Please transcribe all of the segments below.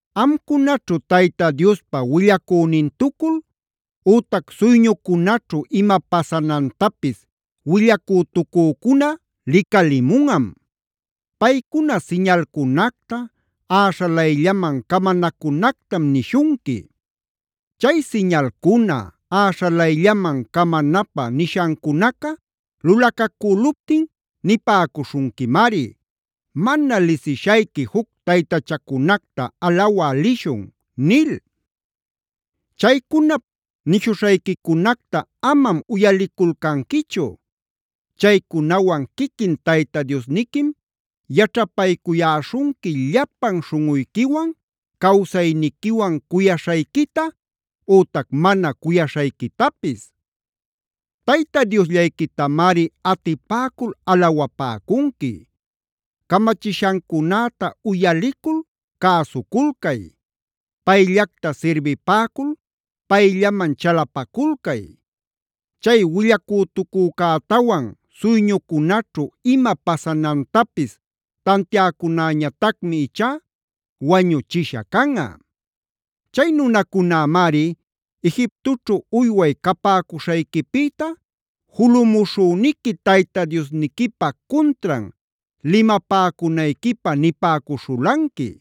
“Amcunaćhu Tayta Diospa willacünintucul ütac suyñucunaćhu ima pasanantapis willacütucücuna licalimunꞌam. Paycuna siñalcunacta, äśhalayllaman camanacunactam nishunqui. Chay siñalcuna, äśhalayllaman camanapä nishancunaca lulacacüluptin nipäcuśhunquimari: ‘Mana lisishayqui juc taytachacunacta alawä lishun’ nil. Chaycunap nishuśhayquicunacta amam uyaliculcanquichu. Chaycunawan quiquin Tayta Diosniquim yaćhapaycuyäśhunqui llapan śhunꞌuyquiwan, cawsayniquiwan cuyaśhayquita ütac mana cuyaśhayquitapis. Tayta Diosllayquitamari atipäcul alawapäcunqui. Camachishancunäta uyalicul cäsuculcay. Payllacta sirbipäcul, payllaman chalapaculcay. Chay willacütucücätawan suyñucunaćhu ima pasanantapis tantiäcunäñatacmi ichá wañuchisha canꞌa. Chay nunacunämari, Egiptoćhu uyway capäcuśhayquipïta julumushüniqui Tayta Diosniquipä cuntran limapäcunayquipä nipäcuśhulanqui.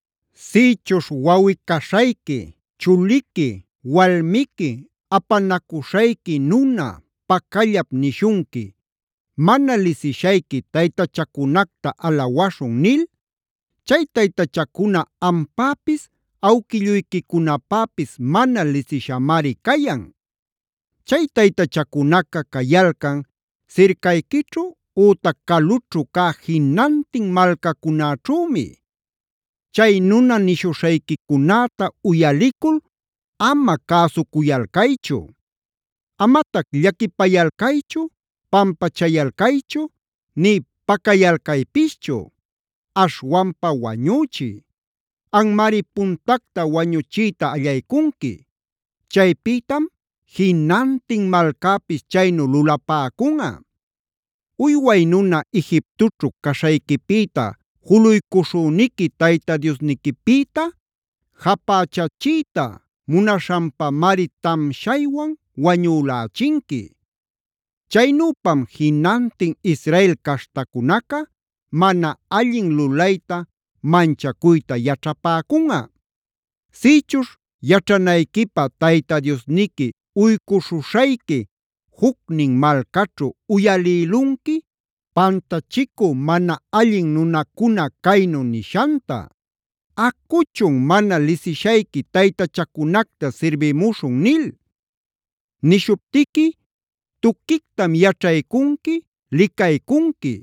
“Sïchuśh wawꞌi-caśhayqui, chuliqui, walmiqui, apanacuśhayqui nuna, pacallap nishunqui: ‘Mana lisishayqui taytachacunacta alawaśhun’ nil. Chay taytachacuna ampäpis, awquilluyquicunapäpis mana lisishamari cayan. Chay taytachacunaca cayalcan sircayquićhu ütac calućhu cä jinantin malcacunäćhümi. Chay nuna nishuśhayquicunäta uyalicul ama cäsucuyalcaychu. Amatac llaquipayalcaychu, pampachayalcaychu, nï pacayalcaypischu. Aśhwanpa wañüchiy. Anmari puntacta wañuchiyta allaycunqui; chaypïtam jinantin malcäpis chaynu lulapäcunꞌa. Uyway nuna Egiptoćhu caśhayquipïta juluycuśhüniqui Tayta Diosniquipïta japächachïta munaśhanpamari tamshaywan wañülächinqui. Chaynüpam jinantin Israel caśhtacunaca mana allin lulayta manchacuyta yaćhapäcunꞌa. “Sïchuśh yaćhanayquipä Tayta Diosniqui uycuśhuśhayqui jucnin malcaćhu uyalïlunqui pantachicü mana allin nunacuna caynu nishanta: ‘Acuchun, mana lisishayqui taytachacunacta sirbimuśhun’ nil. Nishuptiqui tuquictam yaćhaycunqui, licaycunqui.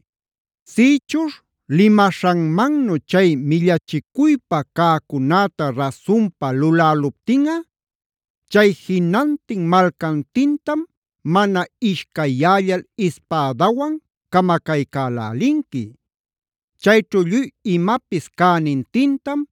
Sïchuśh limaśhanmannu chay millachicuypä cäcunäta rasunpa luläluptinꞌa, chay jinantin malcantintam mana ishcayyällal ispädawan camacaycälälinqui. Chayćhu lluy imapis cänintintam,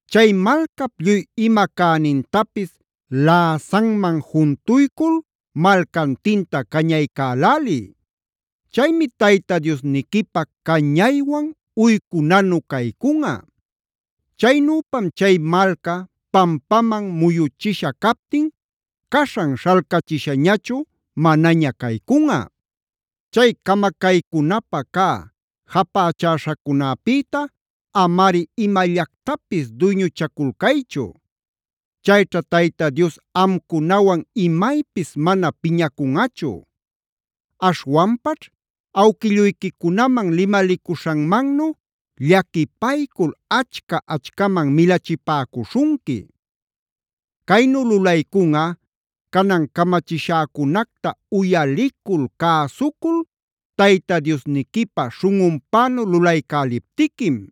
Chay malcap lluy ima cänintapis läsanman juntuycul malcantinta cañaycäläliy. Chaymi Tayta Diosniquipä cañaywan uycunanu caycunꞌa. Chaynüpam chay malca pampaman muyuchisha captin caśhan śhalcachishañachu manaña caycunꞌa. “Chay camacaycunapä cä japächäśhacunäpïta amari imallactapis duyñuchaculcaychu. Chayćha Tayta Dios amcunawan imaypis mana piñacunꞌachu. Aśhwanpaćh awquilluyquicunaman limalicuśhanmannu llaquipaycul achca-achcaman milachipäcuśhunqui. Caynu lulaycunꞌa canan camachishäcunacta uyalicul, cäsucul, Tayta Diosniquipä śhunꞌunpänu lulaycäliptiquim.